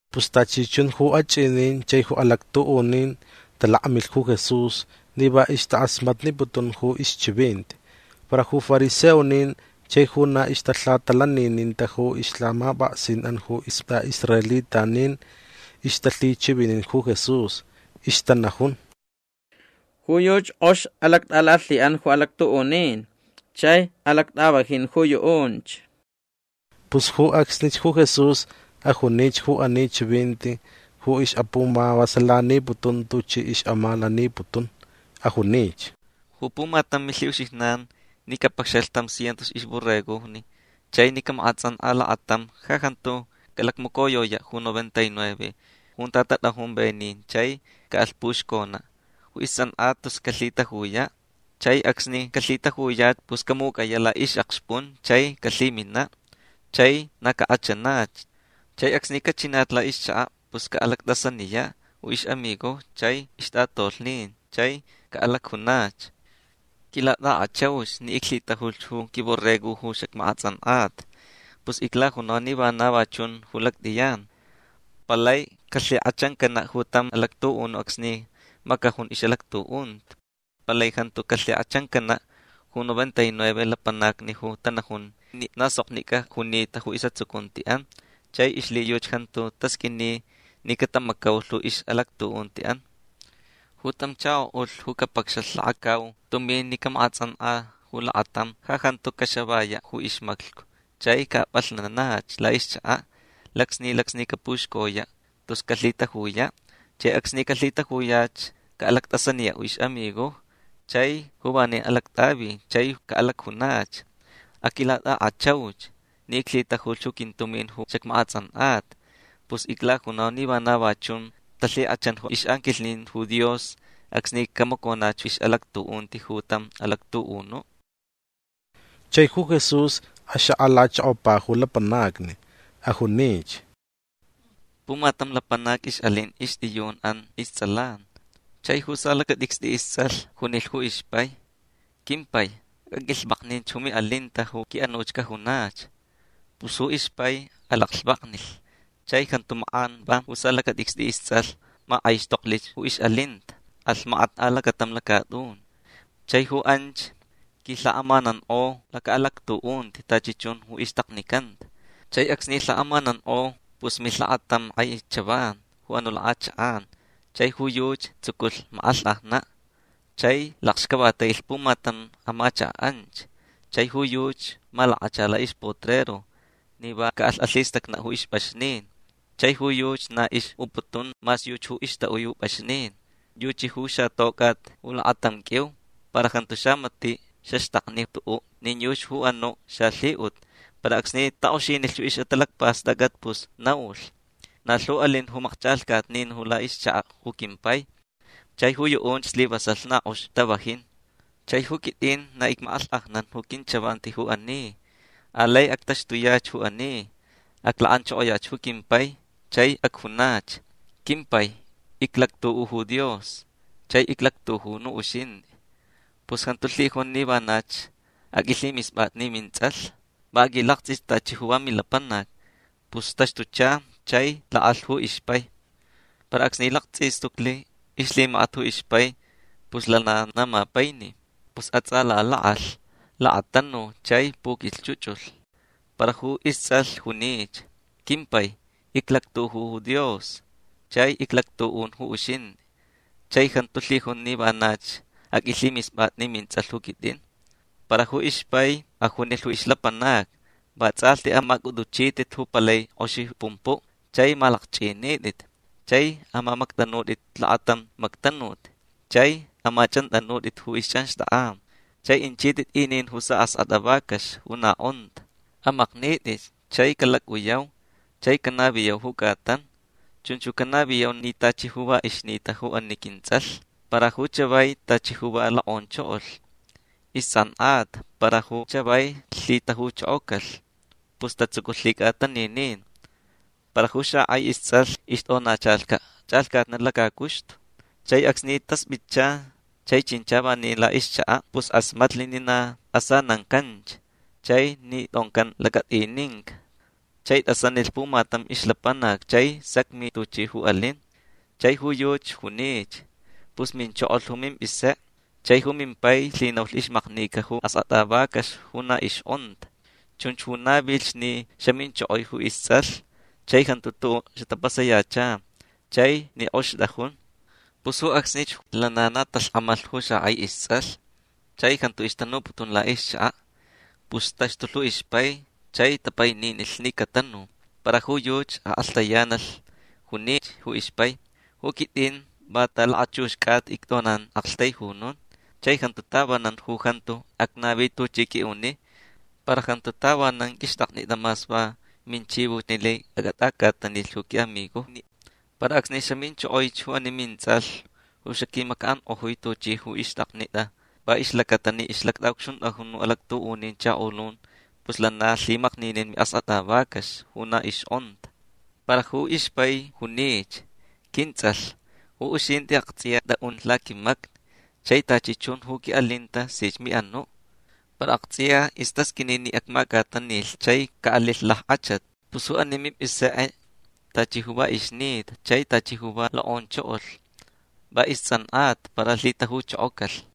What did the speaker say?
Pus tachi chun ju achʼinin chai ju alactuʼunin talakmilh ju Jesús ni va ixtakʼasmatniputun ju ixchivinti. Para ju fariseonin chai ju na ixtalhatalanininta ju ixlhamapʼaksinʼan ju istʼaʼisraelitanin ixtalhichivinin ju Jesús. Ixtanajun: ―Ju yuchi kʼox alactʼalalhiʼan ju alactuʼunin chai alactʼavajin ju yuʼunch. Pus ju acsnich ju Jesús ajunich ju ani chivinti ju ixʼapumavasalaniputun tuchi ixʼamalaniputun. Ajunich: ―Ju pumatam milhiʼuxijnan ni capacxalh tam cientos ixborregojni chai ni camakʼatsʼankʼa lakatam ja jantu calacmacoyoyaʼ ju noventa y nueve junta tatʼajun venin chai caʼalh puxconaʼ ju istsʼankʼata tus calhitajuyaʼ. Chai acsni calhitajuyach pus camucʼayaʼ laʼixʼakxpʼun chai calhiminaʼ chai na cakʼachanach. Chai acsni cachinach laʼixchakaʼ pus caʼalactʼasaniyaʼ ju ixʼamigojni chai ixtʼatolhnin chai caʼalacjunach: “Quilatʼakʼachauch ni iclhitajulh ju quimborrego ju xacmakʼatsʼankʼata”. Pus iclajunau ni vana va chun ju lactʼiyan. Palai calhikʼachancanaʼ ju tam alactuʼunuʼ acsni macajun ju ixʼalactuʼunti. Palai jantu calhikʼachancanaʼ ju noventa y nueve lapanacni ju tanajun ni na soknicʼa junita ju isʼatsucuntiʼan chai ixlhiyuchi jantu tasqʼuini ni catamacaulh ju ixʼalactuʼuntiʼan. Ju tam chakoʼulh ju capacxalh lakacau tumin ni camakʼatsʼankʼa ju lakatam ja jantu caxavayaʼ ju ixmaclhcu chai caʼapʼalhnanach laʼixchakaʼ. Lacsni lacsni capuxcoyaʼ tus calhitajuyaʼ. Chai acsni calhitajuyach caʼalactʼasaniyaʼ ju ixʼamigojni chai ju vanin alactʼavi chai caʼalacjunach: “Aquilatʼakʼachauch ni iclhitajulh ju quintumin ju xacmakʼatsʼankʼata”. Pus iclajunau ni vana va chun talhikʼachan ju ixʼanquilhnin ju Dios acsni camaconach ixʼalactuʼunti ju tam alactuʼunuʼ. Chai ju Jesús axakʼalachokopa ju lapanacni. Ajunich: ―Pumatam lapanac ixʼalin ixtʼiyunʼan istsʼalan. Chai ju salacatʼicstʼi istsʼalh junilh ju ixpai: “Quimpai aqʼuilhvakninch ju miʼalinta ju quiʼanuch cajunach”. Pus ju ixpai alaclhvaknilh. Chai jantu makʼan va ju salacatʼicstʼi istsʼalh makʼaixtoklich ju ixʼalinta. Alh makat alacatam lacatʼun. Chai ju anch quilhakʼamanankʼo lacaʼalactuʼunti tachi chun ju ixtaknicanta. Chai acsni lhakʼamanankʼo pus milh lakatam kʼai chavan ju anuʼ lakʼachakʼan chai ju yuchi tsuculh makʼalhkʼajnaʼ. Chai lakxcavatailich pumatam amachakaʼ anch. Chai ju yuchi malakacha laʼixpotrero ni va caʼalh alhistacnaʼ ju ixpʼaxnin. Chai ju yuchi na ixʼuputun mas yuchi ju ixtaʼui ju pʼaxnin. Yuchi ju xatocʼat lakatam qʼuiu. Para jantu xamatiʼ xaxtakni tuʼuʼ nin yuchi ju anuʼ xalhiʼut. Para acsni takʼoxinilh ju ixʼatalacpastʼacʼat pus naulh: “Na lhu alin ju makchʼalhcatnin ju laʼixchakaʼ ju quimpai chai ju yuʼunch slivasalh na kʼox tavajin. Chai ju quitʼin na icmakʼalhkʼajnan ju quinchavanti ju ani. Alai actaxtuyach ju ani. Aclakʼanchokoyach ju quimpai chai acjunach: Quimpai iclactuʼu ju Dios chai iclactuʼun ju uxintʼi. Pus jantu lhijun ni vanach aqʼuilhimispʼatʼi ni mintsʼalh. Va aqʼuilaktsʼich tachi ju va milapanac”. Pus taxtucha chai lakʼalh ju ixpai. Para acsni laktsʼistucli ixlhimakat ju ixpai pus lana na mapaini. Pus atsʼalalakʼalh. Lakatanu chai puquilhchʼuchʼulh. Para ju istsʼalh junich: “Quimpai iclactuʼu ju Dios chai iclactuʼun ju uxintʼi. Chai jantu lhijun ni vanach aqʼuilhimispʼatʼi ni mintsʼalh ju quitʼin”. Para ju ixpai ajunilh ju ixlapanacni: “Vatsʼalhti amacʼutʼuchitʼit ju palai kʼoxi pumpuʼ chai amalakchʼinitʼit. Chai amamactʼanutʼit lakatam mactanut. Chai amachʼantʼanutʼit ju ixchʼanxtʼakʼan. Chai aʼinchitʼit inin ju askʼatʼa vacax ju na kʼonta. Amaknitʼitch chai calacʼuyau chai canaviyau ju cʼatan. Chunch canaviyau ni tachi ju va ixnita ju ani quintsʼalh para ju chavai tachi ju va lokʼonchokolh. Istsʼankʼata para ju chavai lhitajuchokocalh”. Pus tatsuculh lhicʼataninin. Para ju xakʼai istsʼalh ixtʼonachalhcaʼ chʼalhcatnaʼ lacacuxtu. Chai acsni taspʼitcha chai chincha vanin laʼixchakaʼ pus kʼasmatlich ni na asanancanch chai ni tʼoncan lacatʼininca. Chai tʼasanilh pumatam ixlapanac chai sacmi tuchi ju alin. Chai ju yuchi junich: “Pus minchokolhch ju mimpʼisekʼe chai ju mimpai lhinaulh ixmaknica ju askʼatʼa vacax ju na ixkʼonta. Chunch ju navilh ni xaminchokoi ju istsʼalh chai jantu tuʼuʼ xatapasayacha chai ni kʼox tʼajun”. Pus ju acsnich lana na talhkʼamalh ju xakʼai istsʼalh chai jantu ixtanuputun laʼixchakaʼ. Pus taxtulh ju ixpai chai tapaininilh ni catanu. Para ju yuchi akʼalhtayanalh. Junich ju ixpai: “Ju quitʼin va ta lakachux cʼata ictʼonan aktaijunun. Chai jantu tavanan ju jantu acnavi tuchʼi qʼuiʼuni. Para jantu tavanan qʼuixtʼaknitʼa mas va minchivoch ni laich acʼatʼacʼatanilh ju quiʼamigojni. Para acsni xaminchokoich ju ani mintsʼalh ju xaquimacaʼankʼojui tuchi ju ixtʼaknitʼa va ixlacata ni ixtʼaʼucxuntʼajun ju alactuʼunin chakolun pus lana lhimakninin miʼaskʼatʼa vacax ju na ixkʼonta”. Para ju ixpai junich: “Quintsʼalh ju uxintʼi aktsʼiya tʼaʼun laquimacni chai tachi chun ju quiʼalinta sich miʼanuʼ. Para aktsʼiya istasqʼuini ni acmacʼatanilh chai caʼalilh lackʼachat. Pus ju ani mimpʼisekʼe tachi ju va ixnita chai tachi ju va lokʼonchokolh. Va istsʼankʼata para lhitajuchokocalh”.